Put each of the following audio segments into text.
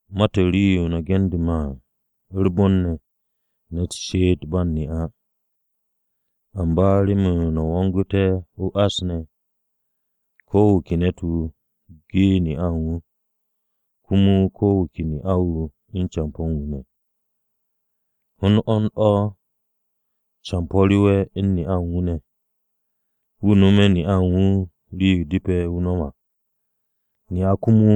Ma-to̱ u̱n rii-yo no̱ gende̱ me̱ à, u̱r-bon ne̱, ne̱t she'et ba u̱n ne'a. Amba remen no̱ wongu̱te̱ o-ás ne̱, ko̱ wu̱ ke ne̱t-wu̱, ge ne'a u̱n wu̱. Komo ko wu̱ ke ne'a-wu̱ u̱n campo̱ u̱n wu̱ ne̱. Hond hond o̱ campo̱ rewe̱ u̱n ne'a u̱n wu̱ ne̱, wu̱ no̱m ne'a u̱n wu̱ rii-yo depe̱ wu̱ nom à. Ne'a komo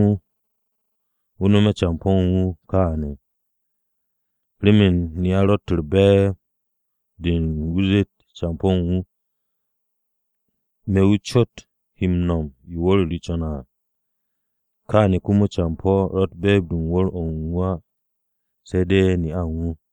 wu̱ nome̱ campo̱ u̱n wu̱ kaane̱. Remen ne'a ro̱tt be̱e̱b-de u̱n wu̱ zeet campo̱ u̱n wu̱, “Me̱ wu̱ cot he m-no̱m yo wu̱r-o re co̱ne̱ à.” Kaane̱ komo campo̱ ro̱tt be̱e̱b-de u̱n wu̱r-o̱ u̱n wu̱ á se̱ de̱ ne'a u̱n wu̱.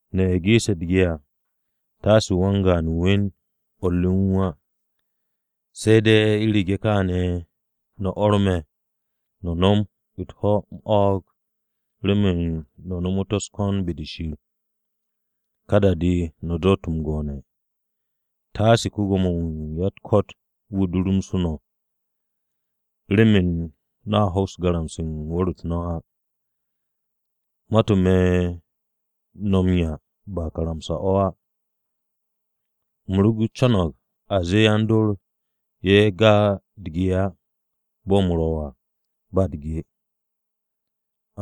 No̱ ye̱ geese̱ u̱t-ge à, taase wan-gaan we̱n o̱r re u̱n wu̱ á, se̱ de̱ u̱rege̱ kaane̱ no̱ orme̱ no̱ nom u̱t-ho̱ m-o̱o̱g remen no̱ nomot u̱s-ko̱n be-de Shir. Ka da-de, no̱ doot m-go'one̱. Taase ko-Gwo̱mo-wu̱ u̱n ya-u̱t-ko̱t wu̱ durumsu̱ no̱, remen no̱a hoks m-garamse̱ wu̱r-u̱t no̱ á. Ma-to̱ me̱ no̱ m-'ya ba karamsa-o̱ á. U̱m ro co̱ng a zee yan-dor ye̱ ga u̱t-ge á bo̱ u̱m ro̱ à ba u̱t-ge.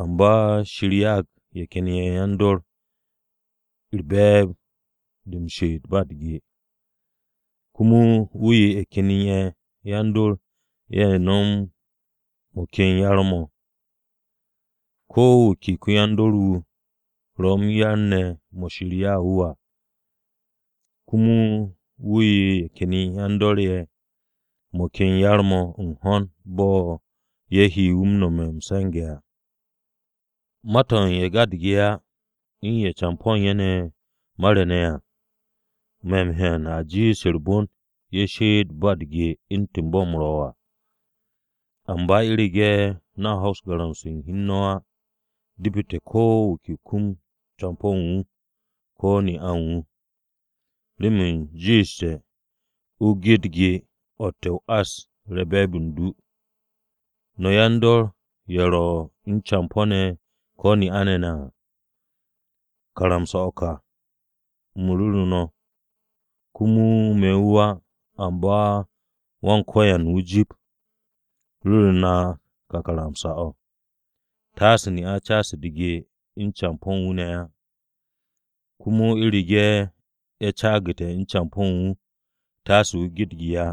Amba Shir ya'ag ye̱ ken yan-dor ye̱ be̱e̱b-de m-she'et ba u̱t-ge. Komo wu̱ 'ye ye̱ ken yan-dor ye̱ mo̱ ken yar-mo̱. Ko̱ wu̱ ke ko-yan-dor-wu̱ ro̱ m-yar ne̱ mo̱ Shir ya'u̱ wu̱ à, komo wu̱ 'ye ye̱ ken yan-dor-ye̱ mo̱ ken yar-mo̱ u̱n ho̱n bo̱ ye̱ he wu̱ nome̱ m-se̱nge̱ à. Ma-to̱ u̱n ye̱ ga u̱t-ge á u̱n ye̱ campo̱ u̱n ne̱ mare̱ ne̱ à, me̱ m-hyan a jiish u̱r-bon ye̱ she'et ba u̱t-ge u̱ntu̱n bo̱ u̱m ro̱ à. Amba u̱rege̱ no̱ hoks garamse̱ u̱n hi u̱n no̱ á, depete̱ ko̱ wu̱ ke wu̱ kum campo̱ u̱n wu̱ ko̱ ne'a u̱n wu̱. Remen jiishte̱ a ge u̱t-ge o̱tte̱ ás-o̱ re be̱e̱b u̱n du. No̱ yan-dor ye̱ ro̱ u̱n campo̱-ne̱ ko̱ ne'a-ne̱ ne̱ à, karamsa-o̱ ka u̱m ru̱ru̱ no̱ (Komo me̱ wu̱ á, amba Wan-Ko̱yan wu̱ jip, ru̱ru̱ na ka karamsa-o̱): Taase ne'a caas u̱t-ge u̱n campo̱ u̱n wu̱ ne̱ á. Komo u̱rege̱ ye̱ caagu̱te̱ u̱n campo̱ u̱n wu̱, taase wu̱ ge u̱t-ge á,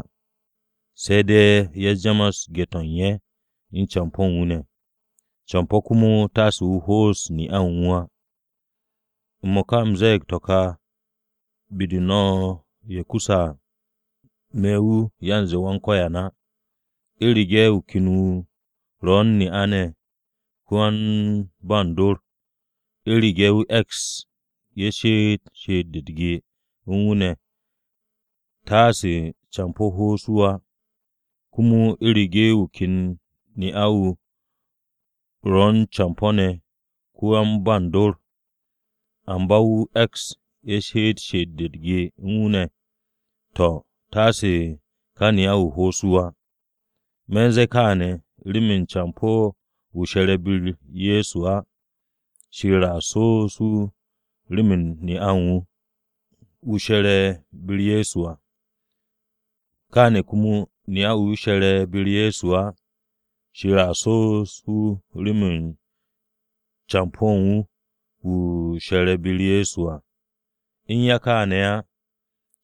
se̱ de̱ ye̱ jamas ge-to̱ u̱n ye̱ u̱n campo̱ u̱n wu̱ ne̱. Campo̱ komo taase wu̱ ho'os ne'a u̱n wu̱ á. M-mo̱ka, u̱m ze̱e̱g to̱ ka be-de no̱ ye̱ kuse̱ à, (me̱ wu̱ yanze Wan-Ko̱yan á), u̱rege̱ wu̱ ken wu̱ ro̱ u̱n ne'a ne̱ ko-yan-ba u̱n dor, u̱rege̱ wu̱ e̱ks ye̱ she'et she'et-de u̱t-ge u̱n wu̱ ne̱ taase campo̱ ho'os wu̱ á. Komo u̱rege̱ wu̱ ken ne'a-wu̱ ro̱ u̱n campo̱ ne̱ ko-yan-ba u̱n dor, amba wu̱ e̱ks ye̱ she'et she'et-de u̱t-ge u̱n wu̱ ne̱, to̱, taase ká ne'a-wu̱ ho'os wu̱ á. Me̱ u̱n ze̱e̱ kaane̱, remen campo̱ wu̱ she̱re̱ be-u̱r Ye̱so á, Shir a so'os wu̱ rem ne'a u̱n wu̱, wu̱ she̱re̱ be-u̱r Ye̱so à. Kaane̱ komo, ne'a wu̱ she̱re̱ be-u̱r Ye̱so á, Shir a so'os wu̱ rem campo̱ u̱n wu̱, wu̱ she̱re̱ be-u̱r Ye̱so à. U̱n ya kaane̱ á,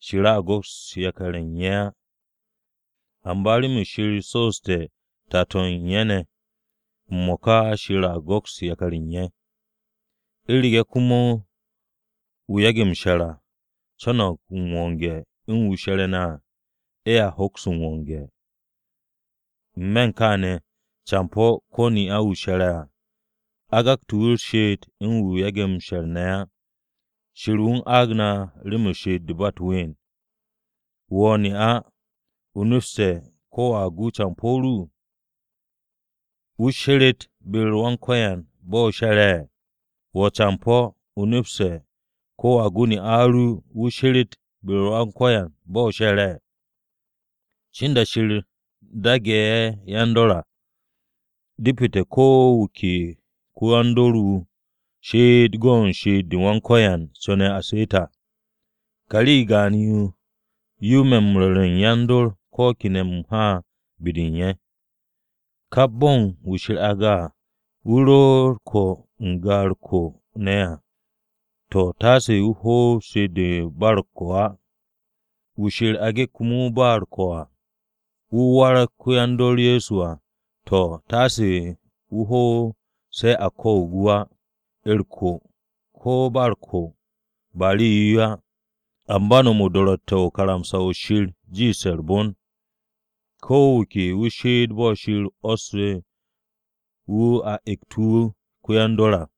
Shir a go̱ks yakar u̱n ye̱ á. Amba remen Shir so'oste̱ tato̱ u̱n ye̱ ne̱, m-mo̱ka Shir go̱kste̱ yakar u̱n ye̱. U̱rege̱ komo wu̱ yage̱ m-she̱r á co̱no̱g m-wonge̱ u̱n wu̱ she̱re̱ à, ye̱a hoks m-wonge̱. N-me̱ u̱n kaane̱, campo̱ ko̱ ne'a wu̱ she̱re̱ à, a gakte̱ wu̱ u̱r-she'et u̱n wu̱ yage̱ m-she̱r ne̱ á. Shir wu̱ u̱n aag na remen she'et-de ba u̱t-ween. Wo̱ ne'a, ¿o nepste̱ ko̱ wo̱a gu campo̱ ru? ¿Wu̱ sheret be-u̱r Wan-Ko̱yan bo̱ o she̱re̱? Wo̱ campo̱, ¿o nepste̱ ko̱ wo̱a gu ne'a ru wu̱ sheret be-u̱r Wan-Ko̱yan bo̱ o she̱re̱? Cin da-o̱ Shir daage̱ ye̱ yan-dor à, depete̱ ko wu̱ ke ko-yan-dor-wu̱ she'et go̱ u̱n she'et-de Wan-Ko̱yan co̱ne̱ wu̱ she'et à. Ka rii gaan-yo yo me̱ m-ru̱re̱ u̱n yan-dor ko̱ kene̱ u̱m ha be-de u̱n ye̱. Kap bo̱n wu̱ Shir aage̱ à, wu̱ ro ko̱ n-ga u̱r-ko̱ ne̱ à, to̱ taase wu̱ hoob she'et-de u̱n ba u̱r-ko̱ á. Wu̱ Shir aage̱ komo ba u̱r-ko̱ à, wu̱ warag ko-yan-dor Ye̱so à, to̱, taase wu̱ hoob se̱ a ko̱o̱g wu̱ á. U̱r-ko̱, ko̱ ba u̱r-ko̱, ba rii-yo á. Amba no̱m o-do̱ro̱tte̱ u̱n karamsa-o̱ Shir jiishte̱ u̱r-bon. Ko wu̱ ke wu̱ she'et bo̱ Shir 'wo̱ssu̱ wu̱ a ekt wu̱ ko-yan-dor à.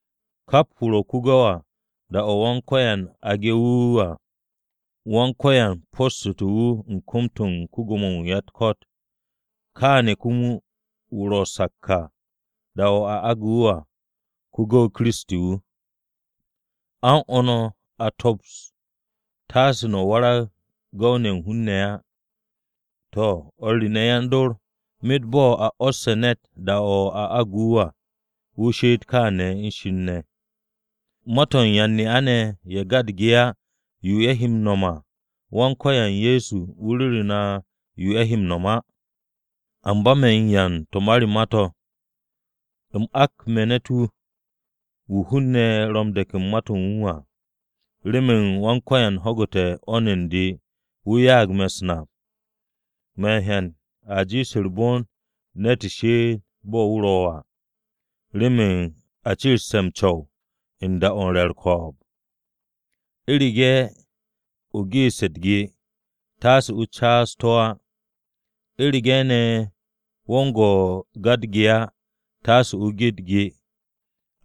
Kap wu̱ ro̱ ko-gu̱w à, da-o̱ Wan-Ko̱yan aage̱ wu̱ à, Wan-Ko̱yan poste̱ wu̱ u̱n kom-to̱ ko-Gwo̱mo-wu̱ u̱n ya-u̱t-ko̱t. Kaane̱ komo wu̱ ro sak à da-o̱ a aage̱ wu̱ à, ko-gu̱w Kiristi wu̱. A u̱n o̱ no̱, komo a tops, taase no̱ warag gu̱w-mo̱ u̱n hun-ne̱ á. To̱, o̱r re ne̱, yan-dor myet bo̱ a 'wo̱sse̱ ne̱t da-o̱ a agu̱ wu̱ à, wu̱ she'et kaane̱ u̱n Shir ne̱. Ma-to̱ u̱n yan-ne'a-ne̱ ye̱ ga u̱t-ge á, yo ye̱ he m-no̱m à, Wan-Ko̱yan Ye̱so wu̱ ru̱ru̱ na yo ye̱ he m-no̱m á. Amba me̱ u̱n 'ya u̱n to̱ ma re ma-to̱, u̱m nak me̱ ne̱t-wu̱, wu̱ hun-ne̱ ro̱ m-de̱k u̱n ma-to̱ u̱n wu̱ à, remen Wan-Ko̱yan ho̱gu̱te̱ 'wo̱n u̱n de wu̱ ya'ag me̱ u̱s-nap. Me̱ m-hyan a jiish u̱r-bon ne̱t she'et bo̱ wu̱ ro̱ à, remen a ciriste̱ m-co̱w u̱n da-o̱ u̱n re̱ u̱r-ko̱o̱b. U̱rege̱ o geeste̱ u̱t-ge, taase o caas to̱ á. U̱rege̱ ne̱ wo̱ u̱n go̱ ga u̱t-ge á, taase o ge u̱t-ge.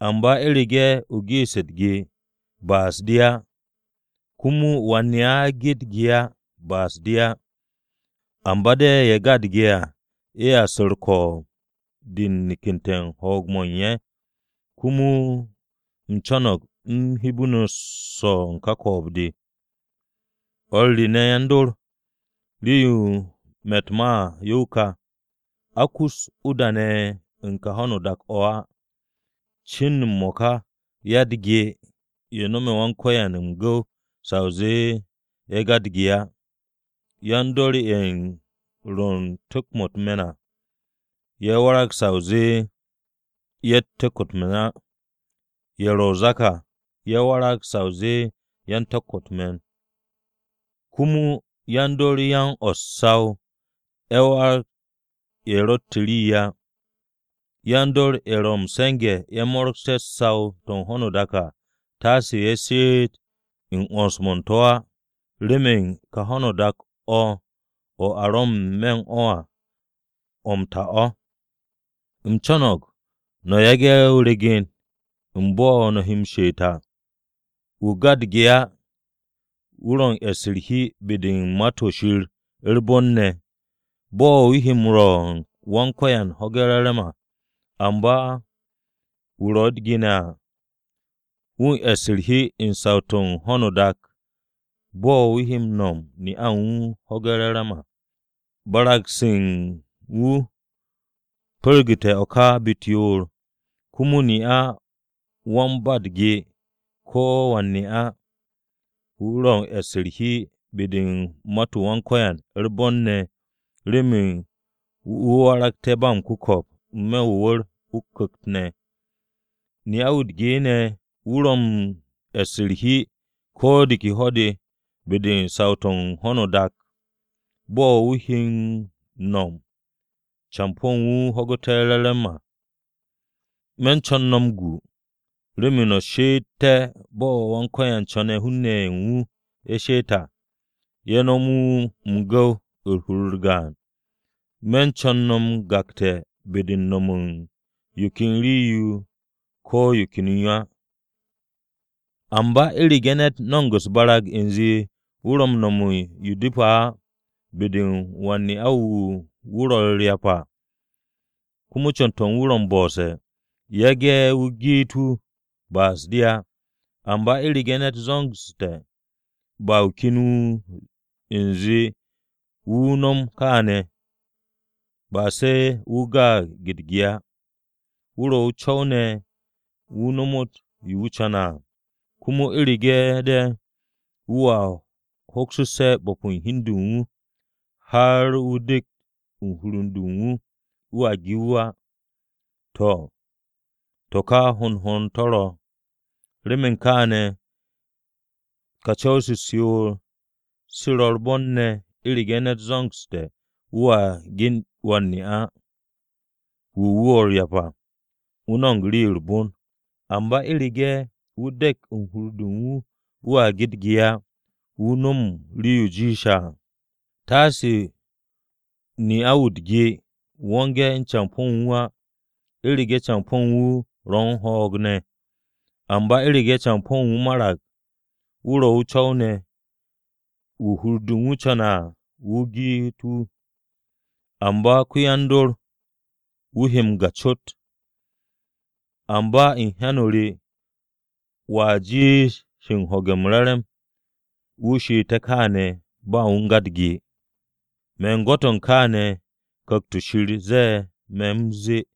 Amba u̱rege̱ o geeste̱ u̱t-ge, ba'as-de á, komo wan-ne'a ge'e̱ u̱t-ge, ba'as-de á. Amba de̱ ye̱ ga u̱t-ge à ye̱a su̱ u̱r-ko̱o̱b de u̱n nekette̱ u̱n ho̱o̱g-mo̱ u̱n ye̱. Komo u̱m co̱no̱g u̱m hebe no̱ swo̱ u̱n ka ko̱o̱b-de. O̱r re ne̱ yan-dor, rii-yo me̱ u̱t-ma à, yo ka: A kus o-da ne̱ u̱n ka ho̱no o-dak o̱ á. Cin u̱n m-mo̱ka, ya-u̱t-ge ye̱ no̱me̱ Wan-Ko̱yan m-gu̱w sa o zee ye̱ ga u̱t-ge á. Yan-dor ye̱ ro̱ u̱n tu̱k-mo̱ u̱t-me̱n à, ye̱ warag sa o zee ye̱tt tu̱k-mo̱ u̱t-me̱n á, ye̱ ro̱ o-zak à ye̱ warag sa o zee yan-tu̱k-mo̱ u̱t-me̱n. Komo yan-dor yan o̱ u̱t-saw ye̱ warag ye̱ ro̱tt rii á. Yan-dor ye̱ ro̱ m-se̱nge̱ mo̱ mo̱ro̱gse̱ saw-to̱ u̱n ho̱no o-dak à, taase ye̱ she'et u̱n 'wo̱ns-mo̱ u̱n to̱ á, remen ka ho̱no o-dak o̱ a ro̱ n-me̱ u̱n o̱ à, o̱ m-ta o̱. U̱m co̱no̱g no̱ yage̱ regen-o̱ u̱n bo̱ no̱ he m-she'et à. Wu̱ ga u̱t-ge á wu̱ ro̱ u̱n e̱ss u̱r-hi be-de u̱n Ma-to̱ Shir u̱r-bon ne̱, bo̱ wu̱ he rwo̱ u̱n Wan-Ko̱yan ho̱ge̱ m-re̱re̱m à. Amba wu̱ ro̱ ne̱ u̱t-ge ne̱ à, wu̱ u̱n e̱ss u̱r-hi u̱n saw-to̱ u̱n ho̱n u̱n ka dak-o̱, bo̱ wu̱ he rwo̱ u̱n ne'a u̱n wu̱ ho̱ge̱ m-re̱re̱m à. Barag-se u̱n wu̱ pu̱rgu̱te̱ o̱ ka be-u̱t yoor. Komo ne'a wan-ba-u̱t-ge ko̱ wan-ne'a, wu̱ ro̱ u̱n e̱ss u̱r-hi be-de u̱n ma-u̱t Wan-Ko̱yan u̱r-bon ne̱ remen wu̱ waragté̱ ba m-ku̱ko̱p n-me̱ o-wu̱r o-ku̱kt ne̱. Ne'a-wu̱ u̱t-ge ne̱ wu̱ ro̱ u̱n e̱ss u̱r-hi ko̱ de ke ho̱-de be-de u̱n saw-to̱ u̱n ho̱no o-dak, bo̱ wu̱ he m-no̱m campo̱ u̱n wu̱ ho̱gu̱te̱ m-re̱re̱m à. Me̱ u̱n co̱n no̱ m-gu, remen no̱ she'etté̱ bo̱ Wan-Ko̱yan co̱ne̱ hun-ne̱ ye̱ u̱n wu̱ she'et à, ye̱ nom wu̱ m-gu̱w u̱n hur-u̱r gaan à. Me̱ co̱n no̱ m-gakte̱ be-de u̱n nom u̱n yo ken rii-yo ko̱ yo ken yo á. Amba u̱rege̱ ne̱t no̱mo̱g u̱s-barag u̱nze wu̱ ro̱ u̱n no̱m u̱n yo depe̱ á be-de u̱n wan-ne'a-wu̱ wu̱ ro̱ u̱r-ryap à, komo co̱n-to̱ u̱n wu̱ ro̱ m-bo̱se̱, yage̱ wu̱ geet wu̱, ba'as-de á. Amba u̱rege̱ ne̱t zo̱ngsu̱te̱ ba wu̱ ken wu̱ u̱n ze̱e̱ wu̱ nom kaane̱, ba se̱ wu̱ gaag u̱t-ge á. Wu̱ ro̱ o-co̱w ne̱ wu̱ nomot yo wu̱ co̱ne̱ à. Komo u̱rege̱ de̱ wu̱a hoksu̱sse̱ bo̱p u̱n hi u̱n de u̱n wu̱, har wu̱ de̱k u̱n hur-de u̱n wu̱, wu̱a ge wu̱ á, to̱, to̱ ka hond hond o̱ to̱ ro̱. Remen kaane̱, kaane̱ ka co̱w-se u̱s-yoor se ro̱ u̱r-bon ne̱ u̱rege̱ ne̱t zo̱ngsu̱te̱ wu̱a ge wan-ne'a-wu̱ wu̱ ro̱ u̱r-ryap à, wu̱ no̱mo̱g rii-yo u̱r-bon. Amba u̱rege̱ wu̱ de̱k u̱n hur-de u̱n wu̱ wu̱a ge u̱t-ge á, wu̱ no̱mo̱g rii-yo jiishe̱ à. Taase ne'a-wu̱ u̱t-ge wonge̱ u̱n campo̱ u̱n wu̱ ne̱ á, u̱rege̱ campo̱ u̱n wu̱ ro̱ u̱n ho̱o̱g ne̱. Amba u̱rege̱ campo̱ u̱n wu̱ marag, wu̱ ro̱ o-co̱w ne̱, wu̱ hur-de u̱n wu̱ co̱ne̱ à, wu̱ geet wu̱. Amba ko-yan-dor, he wu̱ m-ga cot. Amba u̱n hyan-o re, wu̱a jiish u̱n ho̱ge̱ m-re̱re̱m wu̱ she'ete̱ kaane̱ ba wu̱ u̱n ga u̱t-ge. Me̱ gwo̱t-o̱ kaane̱ Ku̱kt-o̱ Shir ze̱e̱ me̱ u̱m zee.